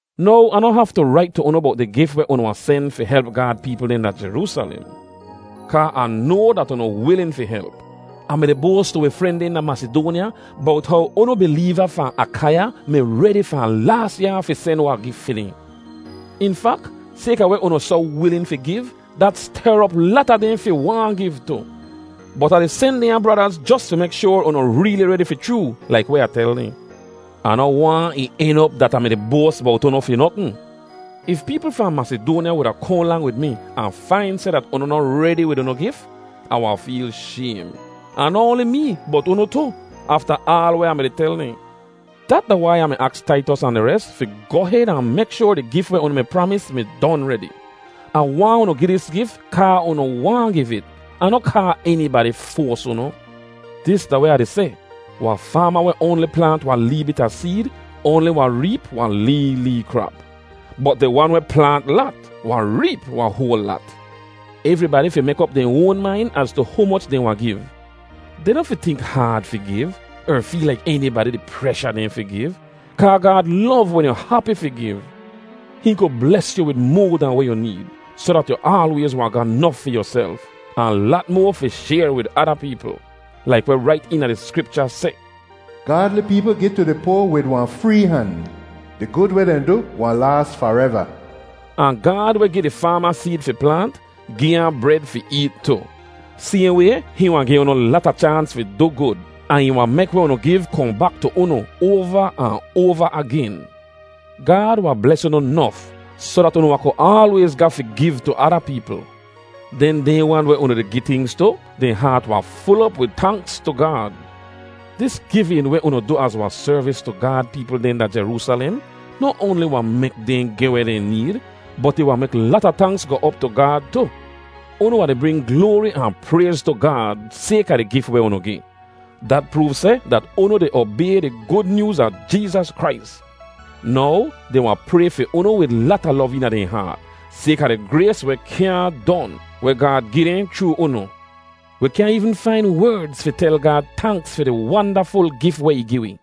Now, Ah noh haftu rait tu unu bowt di gif weh unu wahn sen fi help Gaad peepl dehn da Jeroosalem, kaa Ah noa dat unu wilin fi help. Ah mi-di boas tu wi fren dehn da Masidoanya bowt how unu bileeva fahn Akaiya mi redi fahn laas yaa fi sen wahn gif fi dehn. In fak, sayka weh unu soh wilin fi giv, dat ster op lata dehn fi waahn giv tu. Bot Ah di sen dehnya bradaz jos fi mek shoar unu reeli redi fi chroo laik weh Ah tel dehn. Ah noh waahn ih en op dat Ah mi-di boas bowt unu fi notn. If peepl fahn Masidoanya wuda kohn lang wid mi ahn fain seh dat unu noh redi wid unu gif, Ah wahn feel shaym—ahn noh oanli mee, bot unu tu—afta aal weh Ah mi tel dehn. Dat da wai Ah mi aks Taitos ahn di res fi goh hed ahn mek shoar di gif weh unu mi pramis mi don redi. Ah waahn unu gi dis gif kaa unu waahn giv it, ahn noh kaa enibadi foas unu. Dis da weh Ah di seh: Wahn faama weh oanli plaant wahn lee bit a seed oanli wahn reep wahn lee lee krap. Bot di wan weh plaant lat, wahn reep wahn hoal lat. Evribadi fi mek op dehn oan main az tu humoch dehn wahn giv. Dehn noh fi tink haad fi giv, er feel laik enibadi di presha dehn fi giv, kaa Gaad lov wen yu hapi fi giv. Hihn ku bles yu wid moa dahn weh yu need, soh dat yu aalwayz wahn ga nof fi yuself, ahn lat moa fi shayr wid ada peepl. Laik weh rait eena di Skripcha seh, “Gaadli peepl gi tu di poa wid wahn free han, Di gud weh dehn du wahn laas fareva.” Ahn Gaad weh gi di faama seed fi plaant, gi ahn bred fi eet tu. Sayhn way, hihn wahn gi unu lata chaans fi du gud, ahn ih wahn mek weh unu giv kohn bak tu unu oava ahn oava agen. Gaad wahn bles unu nof soh dat unu wahn ku aalwayz ga fi giv tu ada peepl. Den dehn wan weh unu di gi tingz tu, dehn haat wahn ful op wid tanks tu Gaad. Dis givin weh unu du az wahn servis tu Gaad peepl dehn da Jeroosalem noh oanli wahn mek dehn geh weh dehn need, bot ih wahn mek lata tanks goh op tu Gaad tu. Unu wahn di bring gloari ahn prayz tu Gaad sayka di gif weh unu gi. Dat proov seh dat unu di obay di Gud Nyooz a Jeezas Krais. Now, dehn wahn pray fi unu wid lata lov eena dehn haat, sayka di grays weh kyaahn don, weh Gaad gi dehn chroo unu. Wi kyaahn eevn fain werdz fi tel Gaad tanks fi di wandaful gif weh ih gi wi!